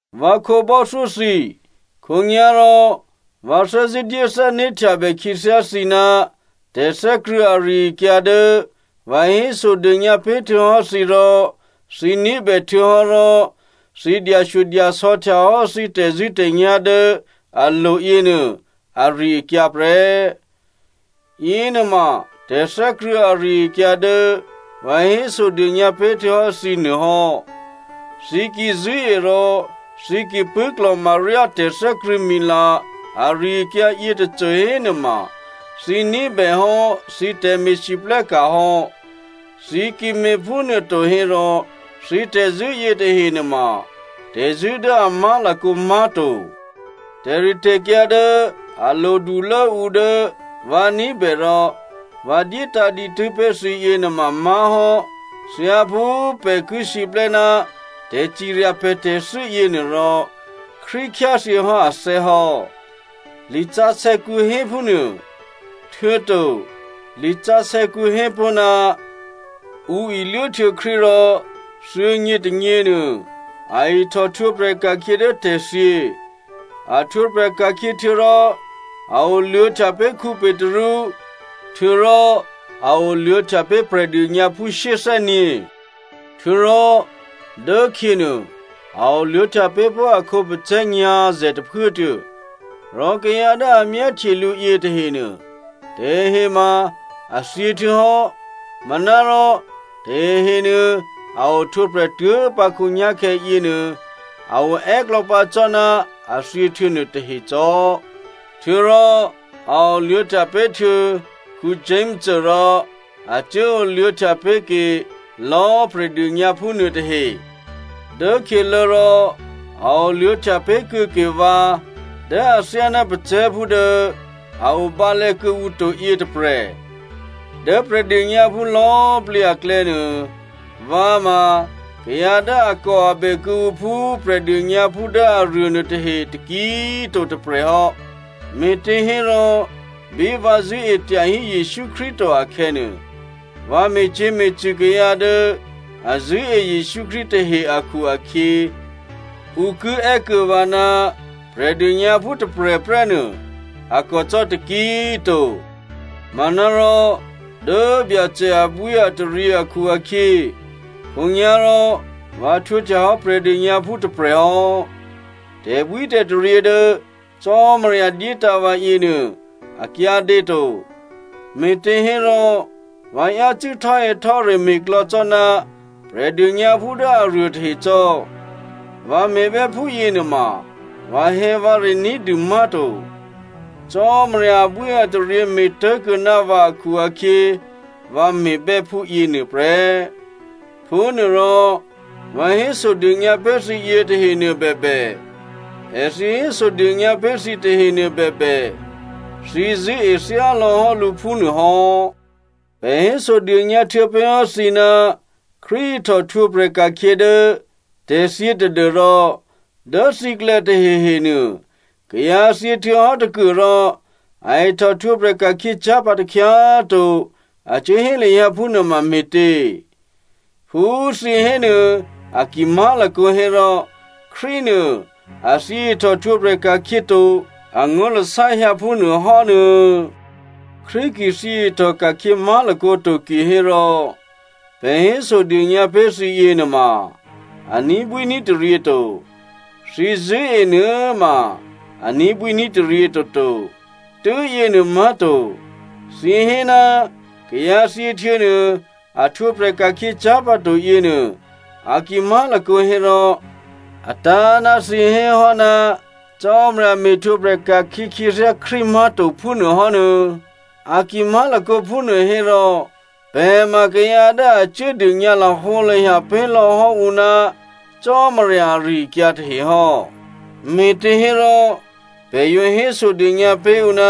Vǎ khǒbò́thyó thǐ, khǒnyá̤rò vǎ thè́zṳ̂́ dyé thè́né̤htyabè khyěthyá thǐ ná tè̤thè́krṳ̂̌ ari-akyǎ dố vǎ hésodônyǎ pé̤ htuô̌hò́ thǐ rò thǐ ní̤bè htuô̌hò́ rò thǐ dyashyodyasò̌ htyahò́ thǐ tè̤zṳ̂́tè̤nyá̤ dố alo̤ yěnuô ari-akyǎ prè́. Yěnuôma tè̤thè́krṳ̂̌ ari-akyǎ dố vǎ hésodônyǎ pé̤ htuô̌hò́ thǐ nuô hò́. Thǐ ki zṳ̂́e rò thǐ ki pṳ̂́klò̤ma ryá tè̤thè́krṳ̂̌mila ari-akyǎ yětôcô hénuôma, thǐ ní̤bèhò́ thǐ tè̤me̤lwóhteka̤ hò́. Thǐ ki me̤ phúnuôto hérò, thǐ tè̤zṳ̂́ yětahe nuôma tè̤zṳ̂́ dố a má̤lakǒ má̤to. Tè̤ritè̤kyǎ dố a lodulố ǔ dố vǎ ní̤bè rò vǎ dyétǎ̤ dǐtû́ pé̤ thǐ yěnuôma má̤hò́, thyáphú pè̤ ki siplè́ ná tè̤cirya pè̤ tè̤thû́ yěnuôrò, Krístu khyáthyě hò́ athè́ hò́, lisǎsè̌kǔ hé phúnuô. Htuô̌to lisǎsè̌kǔ hé pó̤, ǔ iluốhtuô̌ Krístu rò thuô̌nyě tônyěnuô a ihtòhtwǒprè̤ ka̤khyě dố tè̤thyě. A htwǒprè̤ ka̤khyě htuô̌rò a oluô̌htya pé̤ Petru, htuô̌rò a oluô̌htya pé̤ Prè̤dônyǎphú shyéthè́nyě̤. Htuô̌rò dốkhyěnuô, a oluô̌htya pé̤ pó̤ a khǒpacè̤̌ nyǎ̤zè̤ tôphuốtuô̌. Rò kayǎ dố a myáhtye lǔ yětahenuô, tahehe ma a thyěhtuô̌hò́ manárò tahehenuô, a ohtwǒprè̤ tuố̤pǎ khǒnyá̤khè̌ yěnuô a o è́klò̌ pǎ cò́ ná a thyě htuô̌ nuôtahe cò́. Htuô̌rò a oluô̌htya pé̤htuô̌ Jakomo rò a cuố oluô̌htya pé̤ke lò̌꤮ Prè̤dônyǎphú nuôtahe. Dốkhyělố rò a oluô̌htya pé̤ kuô̌ke vǎ dố athyáná pacè̤̌phú dố a o bǎlè̌ kuô̌ǔ to yětôprè̤. Dố Prè̤dônyǎphú lò̌꤮ plǐ aklè̌nuô, vǎ ma kayǎ dố akòabè kuô̌ǔ phú Prè̤dônyǎphú dố aruô nuôtahe taki꤮ to tôprè̤ hò́, me̤těhérò bí vǎ zṳ̂́e tyahí Jesǔ Krístu to akhè̌nuô, vǎ me̤cyě̤me̤cṳ̂ kayǎ dố a zṳ̂́e Jesǔ Krístu tahe akhu-akhyě, ǔ ki è́ kuô̌ vǎ ná Prè̤dônyǎphú tôprè̤prè́nuô꤮ a kòcò́ taki꤮ to. Manárò, dố Byacè abwíataryě akhu-akhyě, khǒnyá̤rò vǎ htwǒhtyahò́ Prè̤dônyǎphú tôprè̤hò́. Tè̤bwítè̤taryě dố Cò́marya dyétǎ̤ vǎ yěnuô a kyǎdě to. Me̤těhérò vǎ yácû́ htò́hè̌htò́re me̤ klò̌ cò́ ná Prè̤dônyǎphú dố aruô tahe cò́. Vǎ me̤bè́ phúyě nuôma vǎhè̌vǎre ní̤dû má̤to. Cò́marya abwíataryě me̤ tố̤kuô̌ ná vǎ akhu-akhyě, vǎ me̤bè́ phúyě nuôprè́. Phúnuôrò, vǎ hésodônyǎ pé̤ thǐ yětahenuô bèbè, èthǐ hésodônyǎ pé̤ thǐ tahenuô bèbè, thǐ zṳ̂́e thyálò̌ hò́ lǔ phúnuô hò́. Pè̤ hésodônyǎ htuô̌ pé̤ hò́ thǐ ná Krístu ihtòhtwǒprè̤ ka̤khyě dố tè̤thyě tadû́rò dố thǐklè̌ tahehenuô, “Kayǎ thyě htuô̌hò́ tôkuôrò a ihtòhtwǒprè̤ ka̤khyěcyá̤ pǎ takhyá꤮ to,” a cuốhé lahyǎ phúnuôma me̤tě? Phú thǐ hénuô a ki má̤lakǒ hérò, Krístunuô, a thyě ihtòhtwǒprè̤ ka̤khyě to, angó̤lasá hyǎ phúnuô hò́nuô̌. Krístu ki thyě ihtòka̤khyě má̤lakǒ to kihérò, pè̤ hésodônyǎ pé̤ thǐ yěnuôma a ní̤bwíní̤taryě to. Thǐ zṳ̂́e nuô꤮ ma a ní̤bwíní̤taryě toto. Tû́yěnuô má̤to, thǐ hé ná kayǎ thyěhtuô̌nuô a htwǒprè̤ ka̤khyě cyá̤pǎto yěnuô a ki má̤lakǒ hérò, a tǎ̤ ná thǐ hé hò́ ná Cò́marya me̤htwǒprè̤ ka̤khyě khyěthyá Krístu má̤to phúnuô hò́nuô̌. A ki má̤lakǒ phúnuô hérò, pè̤ ma kayǎ dố a cuố dônyǎ lahǒlahya pé̤lò̌ hò́ ǔ ná Cò́marya ari-akyǎ tahe hò́, me̤těhérò pè̤ yǒ hésodônyǎ pé̤ ǔ ná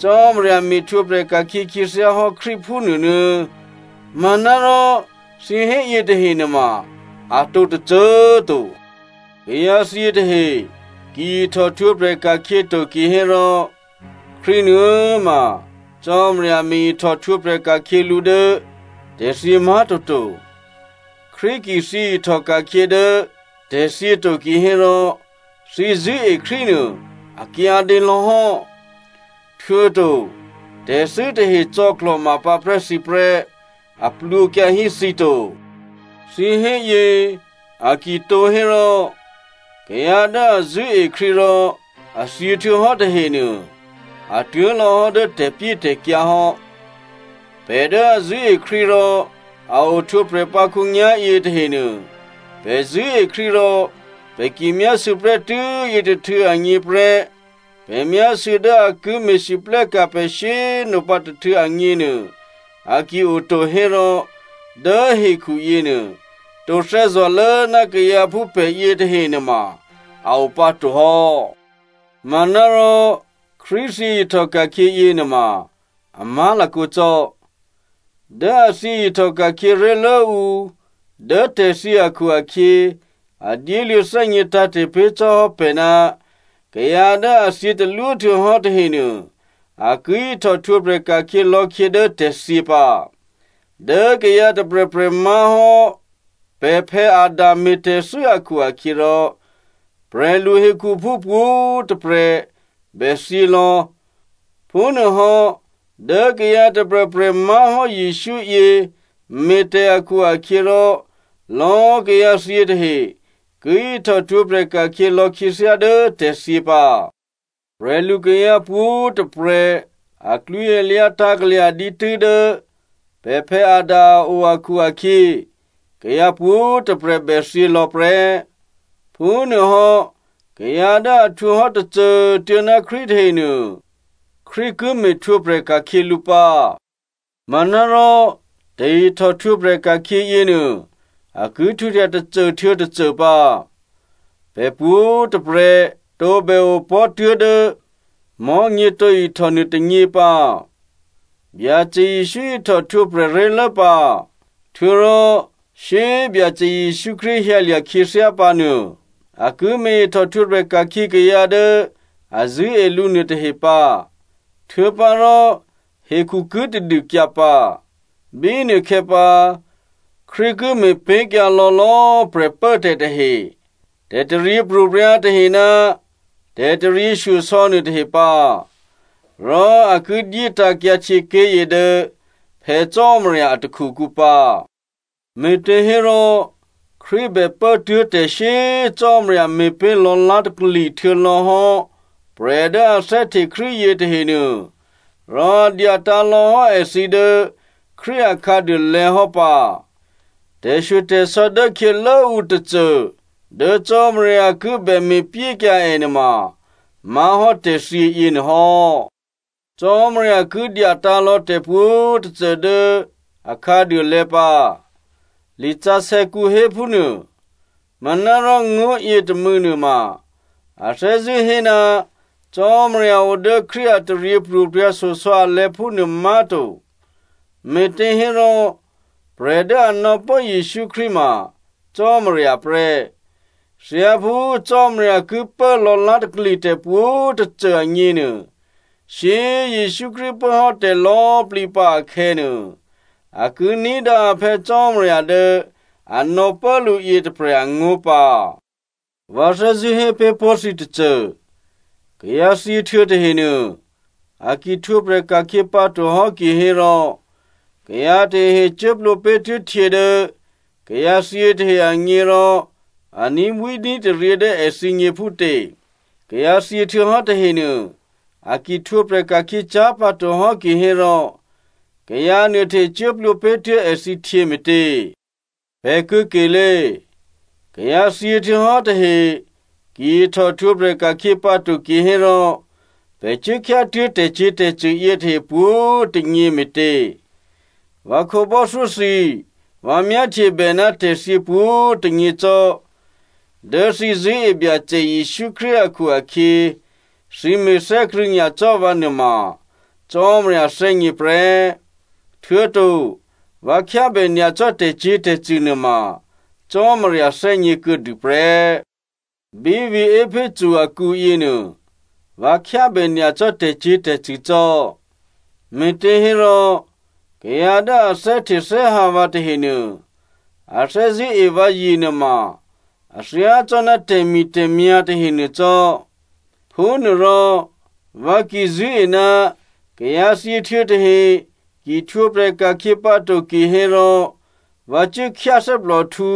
Cò́marya me̤htwǒprè̤ ka̤khyě khyěthyá hò́ Krístu phúnuô nuô̌꤮. Manárò thǐ hé yětahe nuôma atǒ tôcô꤮ to. Kayǎ thyě tahe ki ihtòhtwǒprè̤ ka̤khyě to kihérò, Krístu nuô꤮ ma Cò́marya me̤ ihtòhtwǒprè̤ ka̤khyě lǔ dố tè̤thyě má̤to to. Krístu ki thyě ihtòka̤khyě dố tè̤thyě to kihérò, thǐ zṳ̂́e Krístu nuô a kyǎdě lò̌ hò́. Htuô̌to tè̤thû́ tahe cò̌klò̤ma pǎprè́ thǐ prè́, a plwǒkyǎ hí thǐ to. Thǐ héyě a ki tǒ hérò, kayǎ dố a zṳ̂́e Krístu rò a thyě htuô̌hò́ tahenuô, a tuố̤lò̌ hò́ dố tè̤pyétè̤kyǎ hò́. Pè̤ dố a zṳ̂́e Krístu rò a ohtwǒprè̤ pǎ khǒnyá̤yě tahenuô, pè̤ zṳ̂́e Krístu rò pè̤ ki myásû̌ prè́tû́ yětôhtû̌ agně prè́, pè̤ myásû̌ dố a ki me̤lwóhteka̤ pè̤ shyé꤮ nopǎ tôhtû̌ agněnuô a ki oto hérò, dố hekhu yěnuô, tǒ thè́zò̤lố ná kayǎ phú pè̤ yětahe nuôma a o pǎ to hò́. Manárò, Krístu thyě ihtòka̤khyě yěnuôma a má̤lakǒ cò́. Dố è thyě ihtòka̤khyě ré̤lố ǔ dố tè̤thyě akhu-akhyě, a dyéluô̌ thè́gně tǎ̤te̤ pé̤ cò́ hò́ pè̤ ná kayǎ dố a thyě talwó htuô̌hò́ tahenuô, a ki ihtòhtwǒprè̤ ka̤khyě lò̌khyě dố tè̤thyě pǎ. Dố kayǎ tôprè̤prè̤ má̤hò́ pè̤ Adam me̤tè̤thû́ akhu-akhyěrò, prè̤lu hekhuphú pwǒ̤꤮ tôprè̤ bè thyě lò̌. Phúnuôhò́, dố kayǎ tôprè̤prè̤ má̤hò́ Jesǔ yě me̤ tè̤ akhu-akhyěrò, lò̌꤮ kayǎ thyě tahe ki ihtòhtwǒprè̤ ka̤khyě lò̌ khyěthyá dố tè̤thyě pǎ. Prè̤lukayǎ pwǒ̤꤮ tôprè̤ aklwǐalyǎ tǎ̤ kalya̤ dǐtû́ dố pè̤ Adam a o akhu-akhyě, kayǎ pwǒ̤꤮ tôprè̤ bè thyě lò̌ prè́. Phúnuôhò́, kayǎ dố a htwǒ hò́ tôcô꤮ tuô̌ ná Krístu tahenuô, Krístu ki me̤htwǒprè̤ ka̤khyě lǔ pǎ. Manárò tè̤ihtòhtwǒprè̤ ka̤khyě yěnuô a ki htwǒhtya tôcô htuô̌ tôcô pǎ. Pè̤ pwǒ̤꤮ tôprè̤ tǒbè opò̤́ tuố̤dố mò̤́nyě tǒ ihtò nuôtônyě pǎ. Byacè Jesǔ ihtò htwǒprè̤ ré̤lố pǎ. Htuô̌rò shyé꤮ Byacè Jesǔ Krístu hyǎlya̤ khyěthyá pǎ nuô a ki me̤ ihtòhtwǒprè̤ ka̤khyě kayǎ dố a zṳ̂́e lǔ nuôtahe pǎ. Htuô̌pǎrò, hekhu ki tadûkyǎ pǎ. Bínuôkhè̌ pǎ, Krístu ki me̤pé̤kyǎ lò̌lò̌꤮ prè̤pốtè̤ tahe, tè̤taryěpro̤prya̤ tahe ná tè̤taryěshyosò̌ nuôtahe pǎ. Rò a ki dyétǎ̤kyǎ htyěké̤yě dố Phè̌ Cò́marya a takhukǔ pǎ. Me̤těhérò Krístu bè pố tuố̤ tè̤ shyé꤮ Cò́marya me̤pé̤ lò̌lá̤takli htuô̌lò̌hò́ prè̤ dố a thè́hte Krístu yětahenuô, rò a dyatǎ̤ lò̌ hò́ èthǐ dố Krístu a khǎduôlè̤̌ hò́ pǎ. Tè̤shyotè̤sò̌ dố khyělố ǔ tôcô dố Cò́marya ki bè me̤pyékyǎ è nuôma má̤hò́ tè̤thyě yěnuô hò́. “Cò́marya ki dyatǎ̤ lò̌ tè̤pwǒ̤꤮ tôcô dố akhǎduôlè̤̌ pǎ,” lisǎsè̌kǔ héphúnuô. Manárò ngó̤ yětômû̌nuô ma, a thè́zṳ̂́ hé ná Cò́marya o dố Krístu a taryěpro̤prya̤ shyosò̌ alè̤̌ phúnuô má̤to, me̤těhérò, prè̤ dố a nò̌pố Jesǔ Krístu ma Cò́marya prè́. Thyáphú Cò́marya ki pố lò̌lá̤takli tè̤pwǒ̤꤮ tôcô agněnuô, shyé꤮ Jesǔ Krístu pố hò́ tè̤lò̌꤮ plǐ pǎ akhè̌nuô, a ki ní̤dǎ a Phè̌ Cò́marya dố a nò̌pố lǔ yětôprè̤ angó̤ pǎ. Vǎ thè́zṳ̂́ hé pé̤ pó̤ thǐ tôcô. Kayǎ thyěhtuô̌ tahenuô a ki htwǒprè̤ ka̤khyě pǎto hò́ kihérò kayǎ tahehe cuố plwǒ pé̤ tuố̤ htyě dố kayǎ thyě tahe agně rò a ní̤bwíní̤taryě dố èthǐgně phútě? Kayǎ thyěhtuô̌hò́ tahenuô, a ki htwǒprè̤ ka̤khyě cyá̤ pǎto hò́ kihérò, kayǎ nuôtahe cuố plwǒ pé̤ tuố̤ èthǐ htyě me̤tě? Pè̤ kuô̌kelé꤮, kayǎ thyěhtuô̌hò́ tahe ki ihtòhtwǒprè̤ ka̤khyě pǎto kihérò, pè̤ cuố khyá tuố̤ tè̤cyě̤tè̤cṳ̂ yětahe pwǒ̤꤮ tônyě me̤tě? Vǎ khǒbò́thyó thǐ꤮, vǎ myáhtyebè ná tè̤thyě pwǒ̤꤮ tônyě cò́. Dố thǐ zṳ̂́e Byacè Jesǔ Krístu akhu-akhyě, thǐ me̤thè́krṳ̂̌ nyacò́ vǎ nuôma Cò́marya thè́gně prè́. Htuô̌to, vǎ khyábè nyacò́ tè̤cyě̤tè̤cṳ̂ nuôma Cò́marya thè́gně kuô̌dû prè́. Bí vǐ̤ Epheso akǔ yěnuô, vǎ khyábè nyacò́ tè̤cyě̤tè̤cṳ̂ cò́, me̤těhérò kayǎ dố a thè́htethè́hǎ vǎ tahenuô a thè́zṳ̂́ e vǎzye nuôma a thyácò́ná tè̤mi̤tè̤myá̤ tahenuô cò́. Phúnuôrò, vǎ ki zṳ̂́e ná kayǎ thyěhtuô̌ tahe ki htwǒprè̤ ka̤khyě pǎto kihérò, vǎ cuố khyáthè́plòhtǔ,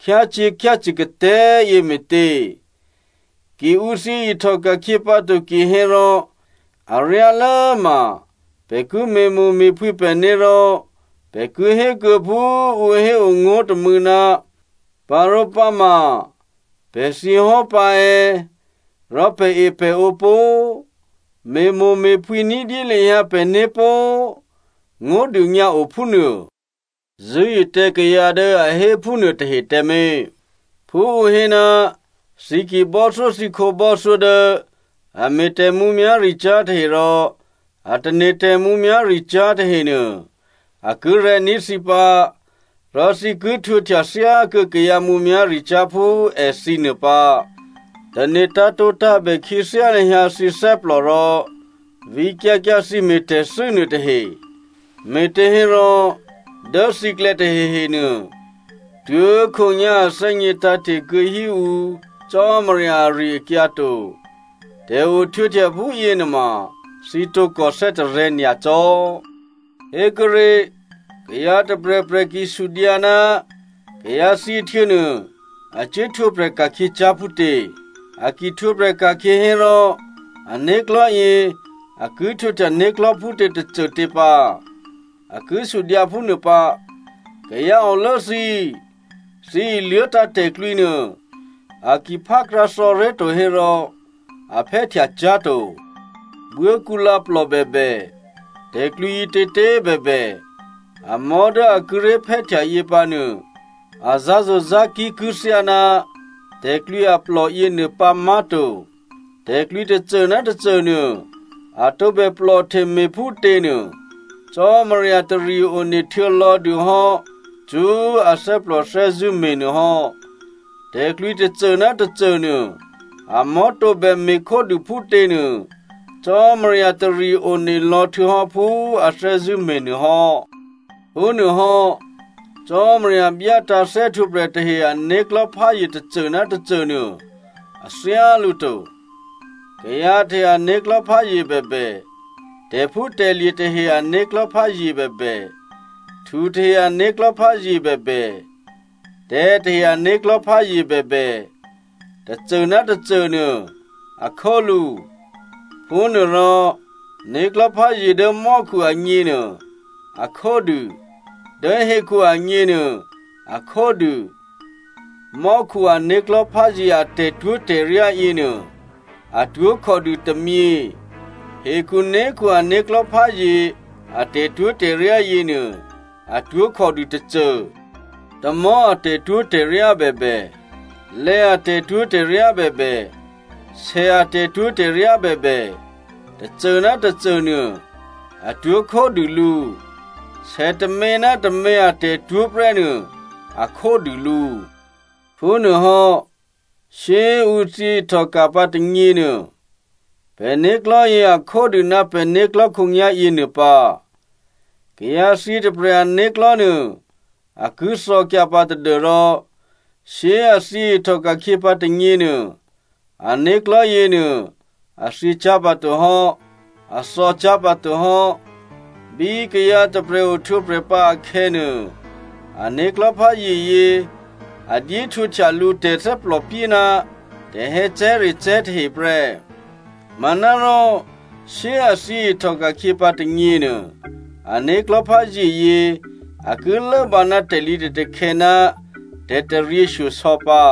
khyácyě̤khyácṳ̂ katè̤́꤮ yě me̤tě? Ki ǔ thyě ihtòka̤khyě pǎ to kihérò, aryálố ma pè̤ ki me̤mo̤me̤phwǐ pè̤né̤ rò pè̤ ki hé kuô̌ phú ǔ héo ngó̤ tômû̌, “Parǒpǎ ma pè̤ thyě hò́ pǎ è̌꤮, rò pè̤epè̤ǒ pó꤮, me̤mo̤me̤phwǐ ní̤dyé lahyǎ pè̤né̤ pó꤮.” Ngó̤ dônyǎ o phúnuô. Zṳ̂́e tǎ kayǎ dố a hé phúnuô tahe tǎmé̤. Phú ǔ hé, “Thǐ ki bò́thyó thǐ khǒbò́thyó dố a me̤ tè̤mǔmyá̤ricyá̤ tahe rò a tane̤ tè̤mǔmyá̤ricyá̤ tahenuô, a ki rè̤̌ní̤ thǐ pǎ rò thǐ ki htwǒhtya thyákuô̌ kayǎ mǔmyá̤ricyá̤ phú èthǐ nuô pǎ.” Tane̤ tǎ̤tǒtǎ̤bè khyěthyá lahyǎ thǐ thè́plò rò vǐkyǎ kyǎ thǐ me̤tè̤thû́ nuô tahe. Me̤těhérò dố thǐklè̌ tahehenuô tuố̤khǒnyá̤ a thè́gně tǎ̤te̤ kuô̌ hí ǔ Cò́marya ari-akyǎ to. Tè̤ohtwǒhtya phúyě nuôma thǐ tǒkò thè́tarè̤̌ nyacò́. Hékuốré̤, kayǎ tôprè̤prè̤ ki sudyǎ, “Kayǎ thyěhtuô̌nuô, a cuố htwǒprè̤ ka̤khyě cyá̤ phútě? A ki htwǒprè̤ ka̤khyě hérò, ané̤klò̤́ yě a ki htwǒhtya né̤klò̤́ phútě tôcôtě pǎ?” A ki sudyǎ phúnuô pǎ. Kayǎ olố thǐ꤮ thǐ iluố̤tǎ̤ tè̤klwǐ nuô, a ki phákrǎthò̌ré̤ to hérò a phè́htya cyá̤to. Buốkǔlǎ plò bèbè, tè̤klwǐ ǐtětě꤮ bèbè, amò̤́ dố a kíré̤ phè́htya yě pǎ nuô a zǎ̤zo̤zǎ̤kí̤ ki thyáná tè̤klwǐ aplò yěnuô pǎ má̤to. Tè̤klwǐ tôcô ná tôcô nuô a tǒbè plòhte me̤ phútě nuô, Cò́marya tari one htuô̌lò̌dû hò́ cṳ́ athè́plò thè́zṳ̂́ me̤nuô hò́. Tè̤klwǐ tôcô ná tôcô nuô, amò̤́ tǒbè me̤khódû phútě nuô, Cò́marya tari one lò̌ htuô̌hò́ phú a thè́zṳ̂́ me̤nuô hò́. Phúnuôhò́, Cò́marya byátǎ̤ thè́htwǒprè̤ tahe ané̤klò̤́ pházye tôcô ná tôcô nuô a thyálǔ to. Kayǎ tahe ané̤klò̤́ pházye bèbè, tè̤phútè̤lye̤ tahe ané̤klò̤́ pházye bèbè, htu tahe ané̤klò̤́ pházye bèbè, tè̤̌ tahe ané̤klò̤́ pházye bèbè, tôcô ná tôcô nuô a khólǔ. Phúnuôrò né̤klò̤́pházye dố mò́khu agněnuô a khódû, dố hekhu agněnuô a khódû. Mò́khu ané̤klò̤́ pházye a tè̤twó̤tè̤ryá yěnuô atwó̤ khòdû tômyě, hekhuné̤khu ané̤klò̤́ pházye a tè̤twó̤tè̤ryá yěnuô atwó̤ khòdû tôcô. Tamò̤́ a tè̤twó̤tè̤ryá bèbè, lè̌ a tè̤twó̤tè̤ryá bèbè, sè a tè̤twó̤tè̤ryá bèbè, tôcô ná tôcô nuô, atwó̤ khódû lǔ. Sè tômě ná tômě a tè̤twó̤ prè́ nuô a khódû lǔ. Phúnuôhò́ shyé꤮ ǔ thyě ihtòka̤ pǎ tônyěnuô, pè̤né̤klò̤́ yě a khódû ná pè̤né̤klò̤́ khǒnyá̤ yěnuô pǎ. Kayǎ thyě tôprè̤ ané̤klò̤́ nuô a ki thò̌kyǎ pǎ tadû́rò shyé꤮ a thyěihtòka̤ pǎ tônyěnuô, ané̤klò̤́ yěnuô a thyěcyá̤ pǎto hò́, a thò̌cyá̤ pǎto hò́. Bí kayǎ tôprè̤ ohtwǒprè̤ pǎ akhè̌nuô, ané̤klò̤́ pházyeyě a dyéhtwǒhtya lǔ tè̤thè́plòpyé ná tè̤hè̌cè̤́recè̤́ tahe prè́. Manárò shyé꤮ a thyě ihtòka̤khyě pǎ tônyěnuô, ané̤klò̤́ pházyeyě a ki lốbǎ ná tè̤lǐtè̤takhè̌ ná tè̤taryěshyosò̌ pǎ.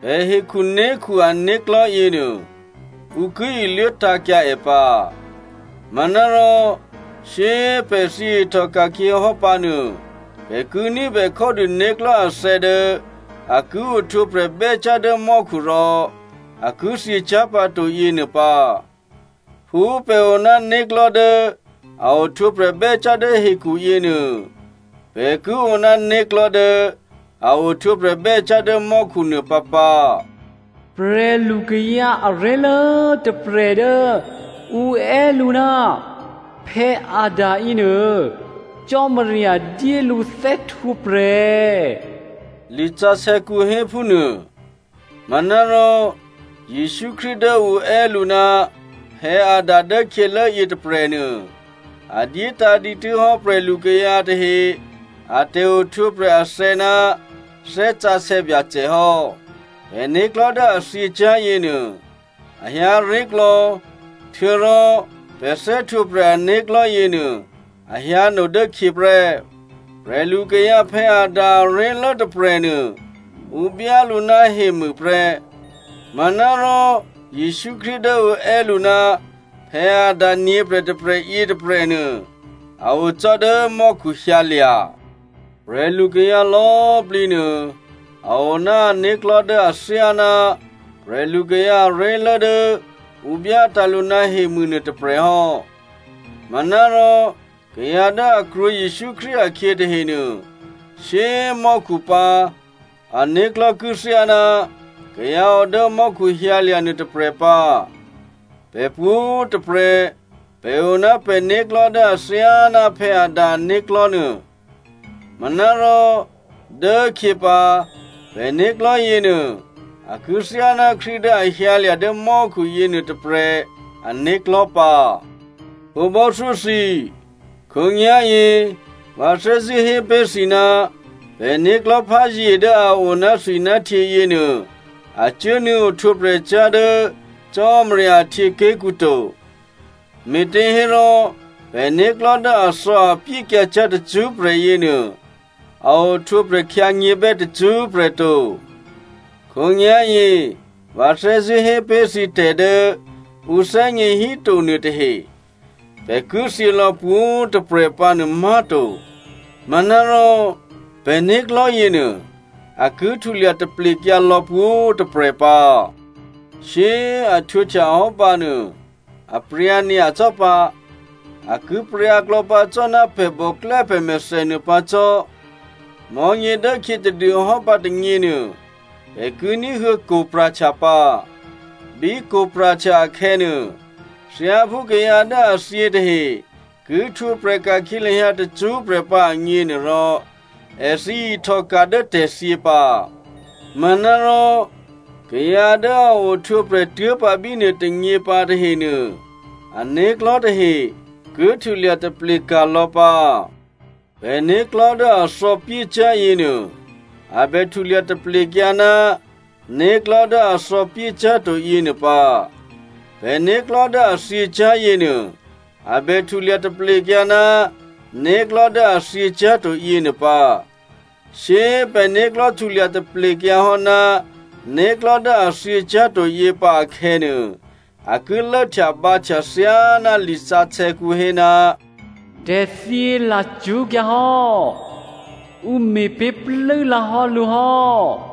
Pè̤ hekhuné̤khu ané̤klò̤́ yěnuô, ǔ ki iluố tǎ̤kyǎ è pǎ. Manárò shyé꤮ pè̤ thyě ihtòka̤khyě hò́ pǎ nuô pè̤ ki ní̤bè khódû né̤klò̤́ athè̌ dố a ki ohtwǒprè̤ bè́cyá̤ dố mò́khu rò a ki thyěcyá̤ pǎto yěnuô pǎ. Phú pè̤ o ná né̤klò̤́ dố a ohtwǒprè̤ bè́cyá̤ dố hekhu yěnuô, pè̤ ki o ná né̤klò̤́ dố a ohtwǒprè̤ bè́cyá̤ dố mò́khu nuô pǎpǎ. “Prè̤lukayǎ aré̤lố tôprè̤ dố ǔ è́ lǔ ná Adam yěnuô Cò́marya dyé lǔ thè́htwǒprè̤,” lisǎsè̌kǔ héphúnuô. Manárò Jesǔ Krístu dố ǔ è́ lǔ ná Adam dố khyělố yětôprè̤nuô, a dyétǎ̤ dǐtû́ hò́ prè̤lukayǎ tahe a tè̤ohtwǒprè̤ athè̌ ná Thè́ Sǎsè̌ Byacè hò́. Pè̤né̤klò̤́ dố a thyěcyá̤ yěnuô a hyǎ ré̤klò̌, htuô̌rò pè̤ thè́htwǒprè̤ ané̤klò̤́ yěnuô a hyǎno dố khyě prè́. Prè̤lukayǎ Adam aré̤lố tôprè̤nuô, ǔ byá lǔ ná hemû prè́. Manárò Jesǔ Krístu dố ǔ è́ lǔ ná Adam nyě̤prè̤ tôprè̤ yětôprè̤nuô a o cò́ dố mò́khu hyǎlya̤. Prè̤lukayǎ lò̌꤮ plǐ nuô a o ná ané̤klò̤́ dố athyáná prè̤lukayǎ aré̤lố dố ǔ byátǎ̤ lǔ ná hemû nuô tôprè̤ hò́. Manárò kayǎ dố a krwǒ Jesǔ Krístu akhyě tahenuô, shyé꤮ mò́khu pǎ, ané̤klò̤́ ki thyáná kayǎ o dố mò́khu hyǎlya̤ nuôtôprè̤ pǎ. Pè̤ pwǒ̤꤮ tôprè̤ pè̤ o ná pè̤né̤klò̤́ dố athyáná Adam ané̤klò̤́ nuô. Manárò dố khyě pǎ pè̤né̤klò̤́ yěnuô a ki thyáná Krístu dố a hyǎlya̤ dố mò́khu yěnuô tôprè̤ ané̤klò̤́ pǎ. Khǒbò́thyó thǐ꤮, khǒnyá̤yě vǎ thè́zṳ̂́ hé pé̤ thǐ ná pè̤né̤klò̤́ pházye dố a o ná thwi ná htyě yěnuô a cuốnuô̌ ohtwǒprè̤cyá̤ dố Cò́marya ahtyěaké̤kǔ to. Me̤těhérò pè̤né̤klò̤́ dố athò̌apyékyǎ cyá̤ tacṳ́prè̤ yěnuô, a ohtwǒprè̤ khyǎnyě̤bè́ tacṳ́prè̤ to. Khǒnyá̤yě vǎ thè́zṳ̂́ hé pé̤ thǐ tè̤ dố ǔ thè́gně híto nuôtahe. Pè̤ ki thyě lò̌ pwǒ̤꤮ tôprè̤ pǎnuô má̤to. Manárò pè̤né̤klò̤́ yěnuô a ki htulya taplekyǎ lò̌ pwǒ̤꤮ tôprè̤ pǎ. Shyé꤮ a htwǒhtya hò́ pǎnuô, apryǎ nyacò́ pǎ, a ki pryǎklò̌ pǎ cò́ ná pè̤ bòklè́ pè̤mèthè nuô pǎ cò́. Mò̤́nyědốkhyě tadûhò́ pǎ tônyěnuô, pè̤ ki ní̤huô̌ kwo̤ pra̤htya pǎ. Bí kwo̤ pra̤htya akhè̌nuô, thyáphú kayǎ dố a thyě tahe ki htwǒprè̤ ka̤khyě lahyǎ tacṳ́prè̤ pǎ agněnuôrò, èthǐ ihtòka̤ dố tè̤thyě pǎ. Manárò kayǎ dố a ohtwǒprè̤ tuố̤pǎ bínuôtônyě pǎ tahenuô, ané̤klò̤́ tahe ki htulya taple ka̤lò̌ pǎ. Pè̤né̤klò̤́ dố a thò̌pyécyá̤ yěnuô, a bè htulya taplekyǎ ná né̤klò̤́ dố a thò̌pyécyá̤to yěnuô pǎ. Pè̤né̤klò̤́ dố a thyěcyá̤ yěnuô, a bè htulya taplekyǎ ná né̤klò̤́ dố a thyěcyá̤to yěnuô pǎ. Shyé꤮ pè̤né̤klò̤́ htulya taplekyǎ hò́ ná né̤klò̤́ dố a thyěcyá̤to yě pǎ akhè̌nuô, a ki lốhtyabǎhtya thyáná lisǎsè̌kǔ hé, “Tè̤thyě lacṳ́kyǎ hò́, ǔ me̤pé̤ plû́lǎ hò́ lǔ hò́.”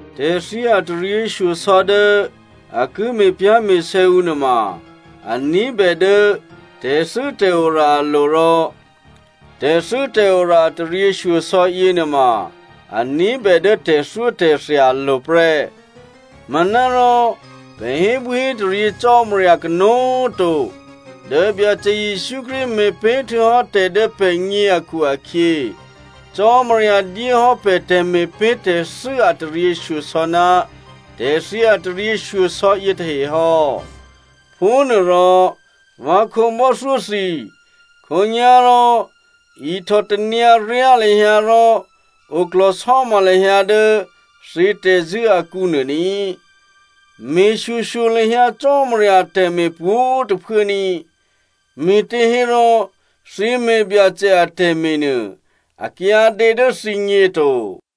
Tè̤thyě a taryěshyosò̌ dố a ki me̤pyá̤me̤sè̌ ǔ nuôma a ní̤bè dố tè̤thû́tè̤ora alo̤ rò tè̤thû́tè̤ora a taryěshyosò̌ yěnuôma a ní̤bè dố tè̤thyótè̤thya alo̤ prè́. Manárò pè̤ hébwíhétaryě Cò́marya kanó̤꤮ to, dố Byacè Jesǔ Krístu me̤pé̤ htuô̌hò́ tè̤ dố pè̤gně akhu-akhyě, Cò́marya dyé hò́ pè̤ tè̤me̤pé̤ tè̤thû́ a taryěshyosò̌ ná tè̤thyě a taryěshyosò̌ yětahe hò́. Phúnuôrò, vǎ khǒbò́thyó thǐ, khǒnyá̤rò ihtò tanyǎryá lahyǎ rò oklò̤sò́ma lahyǎ dố thǐ tè̤zṳ̂́ akǔnuô ní꤮. Me̤ shyoshyo lahyǎ Cò́marya atè̤me̤ pwǒ̤꤮ tôphuố ní꤮, me̤těhérò thǐ me̤ Byacè atè̤me̤ nuô a kyǎdě dố thǐgně to.